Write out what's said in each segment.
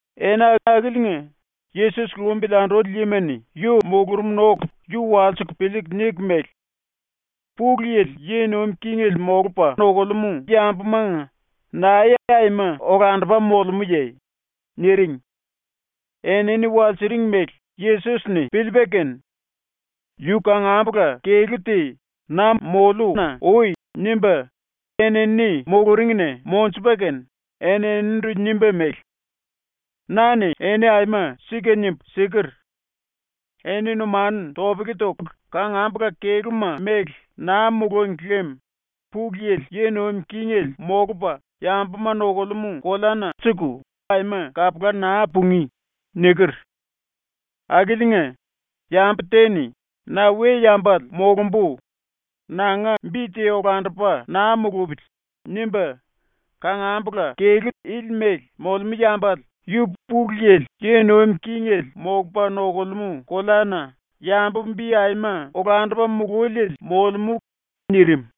Ena akiliinga Yesos lumbili anduli yima-ni yu mulurumna oku yu walsiku piliiku niku mele: “Pulu Yili yi nuim kingele molupa nokulemú yambumanga nae aima olandupa molemúye?” niring. Enini walsiring mele Yesos-ni piliipa kene yu kangambula kelú te “Na moliuna ui.” nimba enini muluringna monjupa kene eninindu nimba mele: “Na-ni eni aima sika nimbu siker: “Eni numanu topele toku kangambula kelúma mele naa mulúngi lem Pulu Yili yi nuim kingele molupa yambuma nokulemú koleana suku aima kapula naa pungí.” niker. Akiliinga, yambu te-ni ‘Na we-yambale molumbu. Nanga bi te olandupa naa mulupili.’ nimba kangambula kelú ili mele molemú yambale yu Pulu Yili yi nuim kingele molupa nokulemú koleana yambu bi aima olandupa mululiele molemú.” ⸤nirim.⸥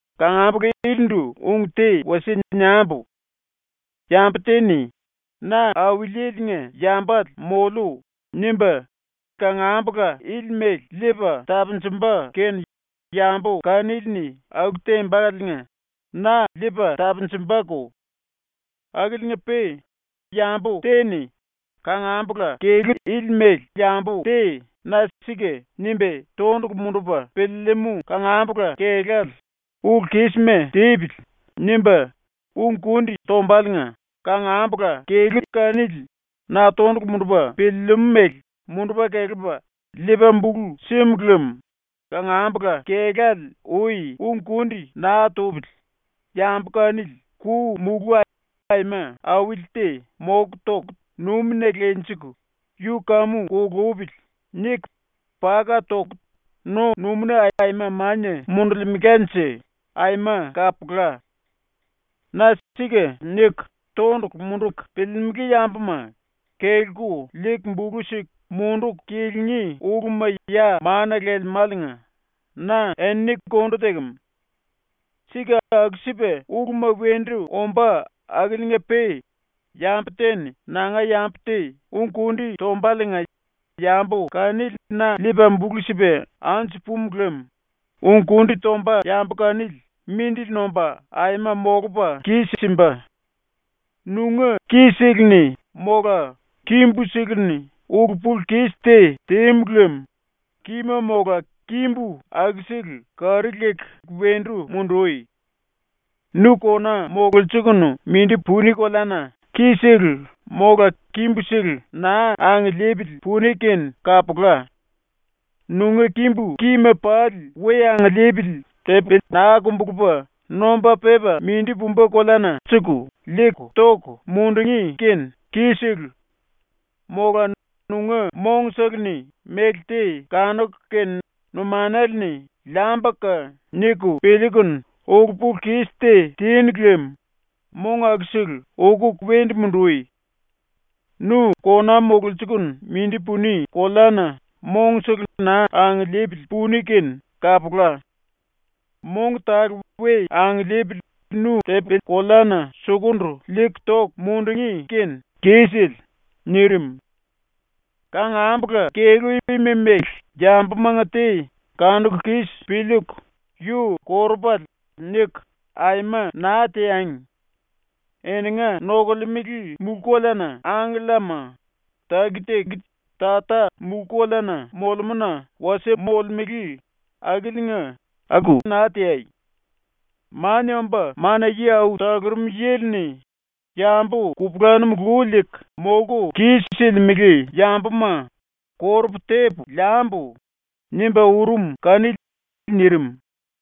“⸤Kangambula ilindu ung te wasie niambu:⸥ Yambu te-ni ‘Na Auliele-nga yambale moliu.’ nimba kangambula ili mele liipa tapunjumba kene yambu kanili-ni aku tembaliinga na liipa tapunjumbako. Akiliinga-pe yambu te-ni ⸤kangambula⸥ kelú ili ⸤mele yambu⸥ te ⸤na ‘Sika’ nimba⸥ tondulu mundupa piliilimú ⸤kangambula⸥ kelále ‘Ulu-kísima tipili.’ nimba ung-kundi tombaliinga ⸤kangambula⸥ kelú kanili na tondulu mundupa piliilimú mele mundupa kelepa liipa bulu símu lem ⸤kangambula⸥ kelále ui ung-kundi naa tupili yambu kanili ku-mulú aima auli te moku toku numina lenjiku ‘Yu kamu kulupili.’ niku paka toku no-numúna aima mania mundulkemelanje aima kapula. “⸤Na⸥ ‘Sika’ niku tondulu munduku piliilimili yambuma kelku liiku bulu siku munduku kilingí uluma ya mana lelemáliinga na enini kondu tekem. Sika aku-sipa uluma wendu ombá akiliinga-pe yambu te-ni nanga yambu te ung-kundi tombaliinga yambu kanili na liipa bulu sipa anju pumu lem ung-kundi tomba yambu kanili mindili nomba aima molupa kis-simba. “Nunga ki-seleni mola kimbu-seleni ulu-pulu-kis te tímu lem kima mola kimbu akusele kari leku wendu mundui. Nu kona mololsiliikunu mindi puni koleana ki-sele mola kimbu-sele naa angiliipili puni kene kapula. Nunga kimbu kima pali we angiliipili tepi naa kumbulupa nomba pepa mindi pumba koleana liiku toku mundungí kene kisele. Mola nunga mongsele-ni méle te kanuku kene numanale-ni ‘Liambuka.’ niku piliikunu ulu-pulu-kis te tinu lem mong akusele ukuku wendu mundui. Nu kona mololsiliikunu mindi puni koleana mongsele naa angiliipili puni kene kapula. Mong tale we angiliipili nu tepi-koleana sukundu liiku toku mundungí kene kisele.” ⸤nirim.⸥ “⸤Kangambula⸥ kelú ima ⸤mele yambuma⸥ nga te kanuku kis piliiku ‘Yu korupale.’ niku aima naa teangi. Eninga nokolemele mulú-koleana angkellama taki-taki Tata mulú-koleana molemúna wasie molemele akiliinga ⸤aku naa teai⸥. (Mania Omba Mana-Yi Au Talurum Yili-ni ‘Yambu kupulanum lu liiku molku kis-silimele yambuma korupu tepu liambu.’ nimba urum kanili.)” ⸤nirim.⸥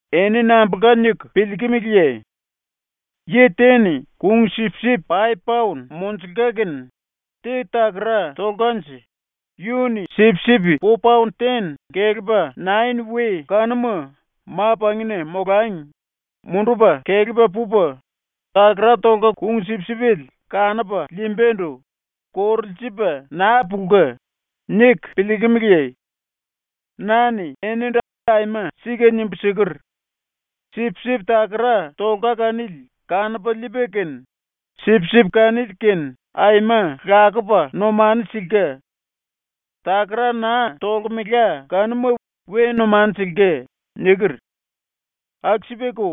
“Eni nambulka niku piliikimiliye? ‘Yi te-ni kung-sipsip paip paon monjulka kene, te takara tolkanje, yu-ni sipsip po paon ten kelepa nain we kanuma ma-pangina molangi mundupa kelepa pupa, takara tolka kung-sipsipele kanupa liimbandu korulsiliipa naa pulka.’ niku piliikimiliye? Na-ni enindu aima sika nimbu siker: “Sipsip takara tolka kanili kanupa liipa kene sipsip kanili-kene aima lakupa numanu silka. Takara naa tolkemela kanuma we numanu silka.” niker. Aku-sipako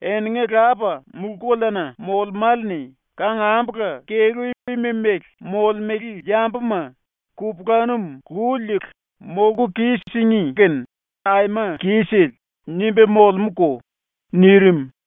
eninga Lapa mulú-koleana molemále-ni kangambula kelú ima ⸤mele molemele yambuma⸥ ‘kupulanum lu liiku molku kis-singí kene aima kisele.’ nimba molemúko.” ⸤nirim.⸥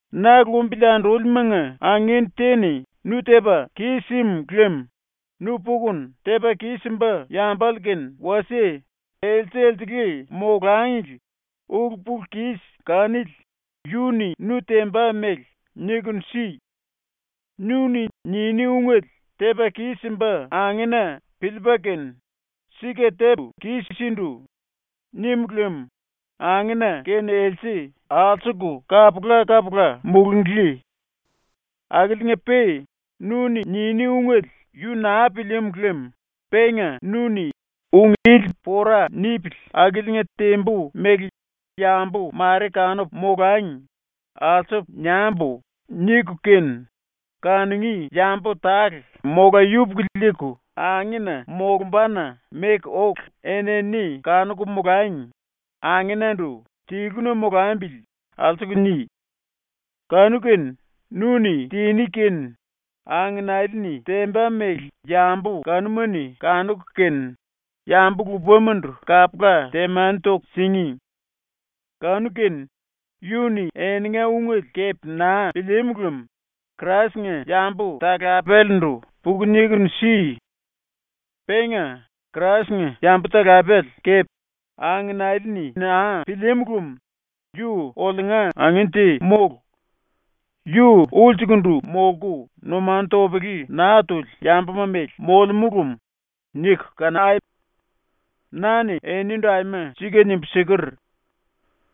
“⸤Na lumbili andúlimanga⸥ angin te-ni nu tepa kis-sim lem nu pukunu tepa kis-simba yambale kene wasie else-elsele molangli ulu-pulu-kis kanili yu-ni nu temba mele nikunu si. Nu-ni niní ungele tepa kis-simba angena piliipa kene “Sika tepu kis-sindu.” nim lem angena kene else alsuku kapula-kapula mulunglí. Akiliinga-pe nu-ni niní ungele yu naa pilíímu lem penga nu-ni ‘Ung ili pora nipili akiliinga tembu mele yambu mare kanuku molangi alsupu niambu.’ niku kene, kanungí yambu tale mola yupuku liiku angena molumbana meku oku enini kanuku molangi angenandu ‘Tiluna molambili.’ alsuku ni. Kanu-kene nu-ni tiní kene angenale-ni temba mele yambu kanuma-ni kanuku kene yambu lupamandu kapula temani toku singí. Kanu-kene yu-ni eninga ungele kepe naa pilíímu lem Krais-nga yambu-talapelendu puku nikunu si. Penga Krais-nga yambu-talapele kepe angenale-ni naa pilíímu lem ‘Yu oliunga angin te mólu. Yu ulsukundu molku numanu topele naa tuli yambuma mele molemú lem.’ niku kanai. “Na-ni enindu aima sika nimbu siker: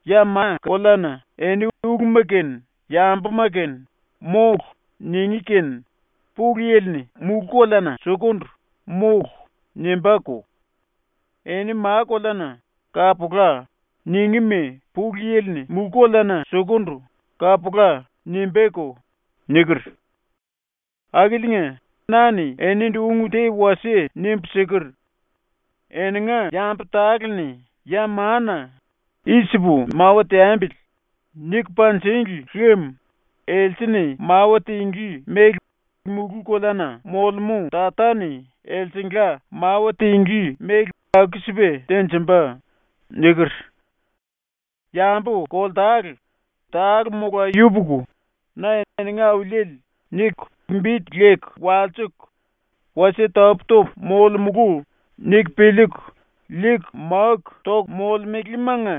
“Ya ma-koleana eni ⸤uluma kene yambuma kene⸥ “Mólu.” ningí kene Pulu Yili-ni mulú-koleana sukundu “Mólu.” nimbáko; eni ma-koleana “Kapula.” ningíma Pulu Yili-ni mulú-koleana sukundu “Kapula.” nimbáko.” niker. “⸤Akiliinga⸥ na-ni enindu ung te wasie nimbu siker: “Eninga yambu tale-ni ya mana “I-sipu mawa teambili.” niku panjíngli lem else-ni mawa tinglí mele mulú-koleana molemú Tata-ni elsengla mawa tinglí mele aku-sipa tenjimba.” niker. Yambu ⸤koltale,⸥ tale mola yupuku, na “eninga Auliele” niku bi leku walsiku, ‘Wasie tapú-topu molemulu.’ niku piliiku liiku máku toku molemelemanga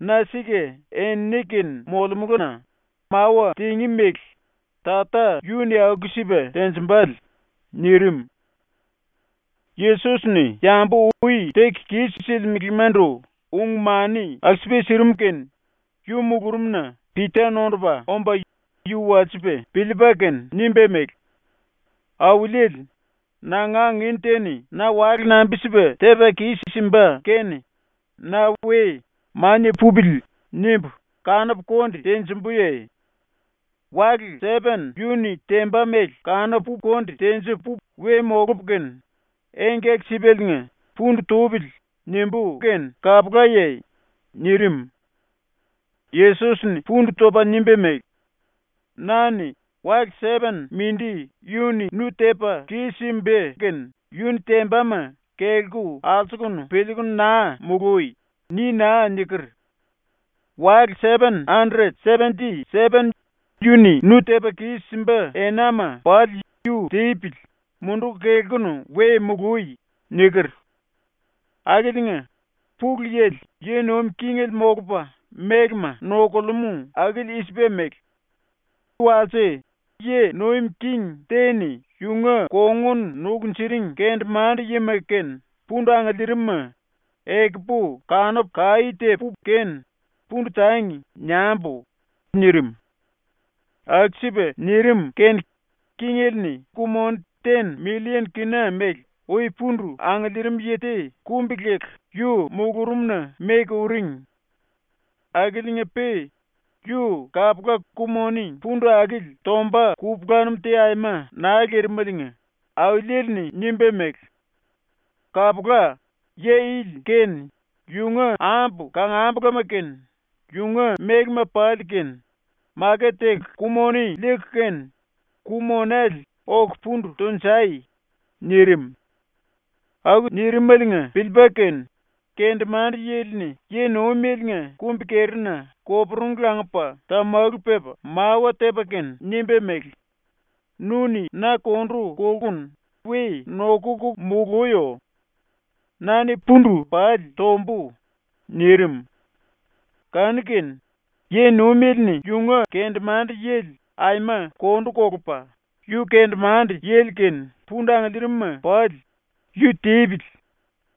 na ⸤sika⸥ enini-kene molemulu-na ⸤mawa tingí mele Tata yu-ni aku-sipa tenjimbale⸥.” nirim. ⸤Yesos-ni yambu ui teku kis-silimelemandu ung-mani aku-sipa sirim⸥ kene yu mulurumna Pita nondupa omba yu walsipa piliipa kene nimba mele: “Auliele, nanga angin te-ni na wale nambi-sipa tepa kis-simba kene na we ‘Mania pupili.’ nimbu kanupu konde tenjumbuye? Wale sepen yu-ni temba mele kanupu konde tenjipu we molupu kene engkaki-sipaliinga ‘Pundu tupili.’ nimbú kene kapulaye?” nirim. Yesos-ni pundu topa nimba mele: “Na-ni “Wale sepen ⸤mindi⸥ yu-ni nu tepa kis-simba kene yu-ni tembama kelku alsukunu piliiku naa mului.” ni naa niker. “Wale sepen andret sependi sepen yu-ni nu tepa kis-simba enama pali yu tipili, munduku kelkunu we mului.” niker. “Akiliinga Pulu Yili yi nuim kingele molupa mélema nokulemú akili i-sipa mele: “Walse yi nuim king te-ni yunga kongun nukunjuring kendemande-yima kene pundu angiliirim-ma ‘Ekupu kanupu kaí tepu kene “Pundu tangi.” niambu.’ nirim. Aku-sipa nirim kene kingele-ni ku-moni ten millien kina mele ui pundu angiliirim yi te kumbi-leku yu mulurumna meku uring. Akiliinga-pe yu kapula ku-moni pundu akili tomba kupulanum te aima naa lirimeliinga auliele-ni nimba mele: “Kapula, yi ili kene yunga ambu kangambulama kene yunga mélema pali kene maket teku ku-moni liiku kene ku-monele oku pundu tunjai.” nirim. Aku nirimeliinga piliipa kene kendemande-yili-ni yi-nuimeliinga kumbi-kerina koporungu langupa tamalu pepa mawa tepa kene nimba mele: “Nu-ni na kondu kolkunu we nokuku muluyo. Na-ni pundu pali tombu.” nirim. ⸤Kanu-kene⸥ yi-nuimele-ni yunga kendemande-yili aima kondu kolupa yu kendemande-yili kene pundu angiliirim-ma pali “Yu tipili.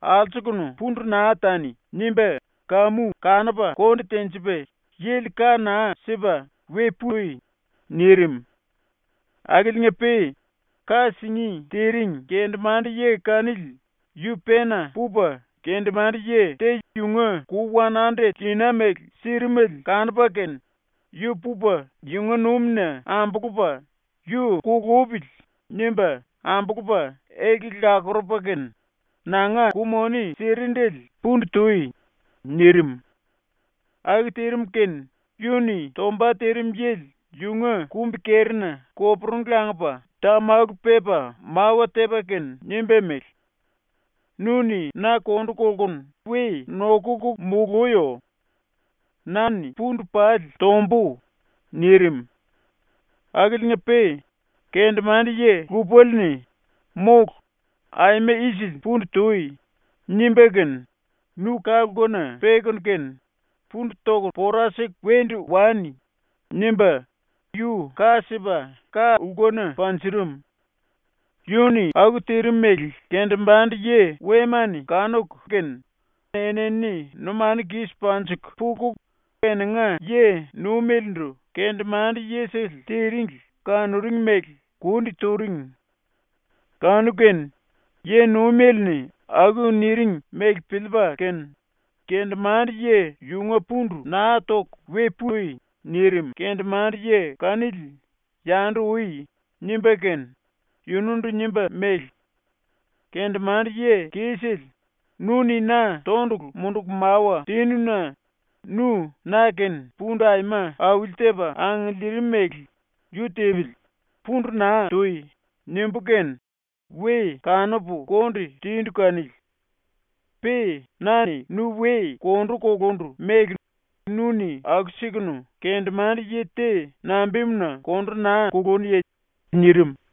Alsukunu pundu naa tani.” nimba kamu kanupa konde tenjipa yili ka naa sipa “We pui.” nirim. Akiliinga-pe ⸤ka singí tiring⸥ kendemande-yi kanili yu pena pupa kendemande-yi te yunga ku wan andret kina mele sirimele kanupa kene, yu pupa yunga numina ambulupa ‘Yu kulupili.’ nimba ambulupa elkele lakurupa kene “Nanga ku-moni sirindele pundu tui!” nirim. Aku tirim kene yu-ni tomba tirim yili yunga kumbi-kerina koporungu langupa tamalu pepa mawa tepa kene nimba mele: “Nu-ni na kondu kolkunu we nokuku muluyo. Na-ni pundu pali tombu.” nirim. Akiliinga-pe kendemande-yi lupale-ni “Mólu, aima isili pundu tui!” nimba kene “Nu ka-lkuna pekunu kene pundu toku pora siku wendu wani.” nimba yu ka sipa ka-lkuna panjurum. Yu-ni aku tirim mele kendemande-yi wema-ni kanuku kene enini numanu kis panjiku puku eninga yi-nuimelendu kendemande-yisele tiringli kanuring mele kundi turing. Kanu-kene yi-nuimele-ni aku niring mele piliipa kene kendemande-yi yunga pundu “Naa toku we pui.” nirim kendemande-yi kanili “Yandu ui.” nimba kene yunundu nimba mele: “Kendemande-yi kisele, nu-ni na tondulu munduku mawa tínu-na nu na-kene pundu aima auli-tepa angiliirimele “Yu tipili, pundu naa tui.” nimbu kene we kanupu konde tindu kanili. Pe na-ni nu we kondu kulundu mele nu-ni aku-sikunu kendemande-yi te nambimuna kondu naa kulúnuye?” nirim.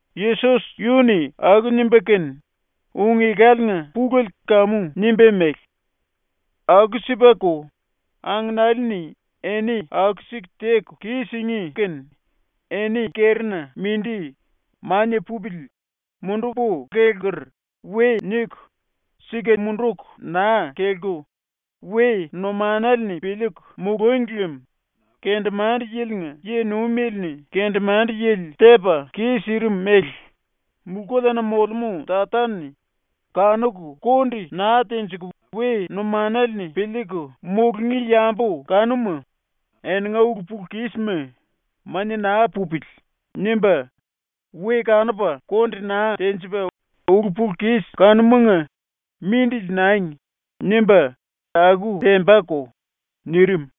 ⸤Yesos yu-ni aku nimba kene ung-ekaliinga pulele kamu nimba mele:⸥ “Aku-sipako, angenali-ni eni aku-siku teku kis-singí kene eni kerina mindi “Mania pupili. Mundupu kelker.” we niku, sika munduku naa kelku, we numanale-ni piliiku mulúngi lem, ⸤kendemande-yilinga yi-nuimele-ni kendemande-yili tepa kis-sirim mele⸥ mulú-koleana molemú Tata-ni kanuku konde naa tenjiku we numanale-ni piliiku mulungí yambu kanuma eninga ulu-pulu-kisma ‘Mania naa pupili.’ nimba, we kanupa konde naa tenjipa ulu-pulu-kis kanumanga “Mindili nangi.” nimba aku tembako.” nirim.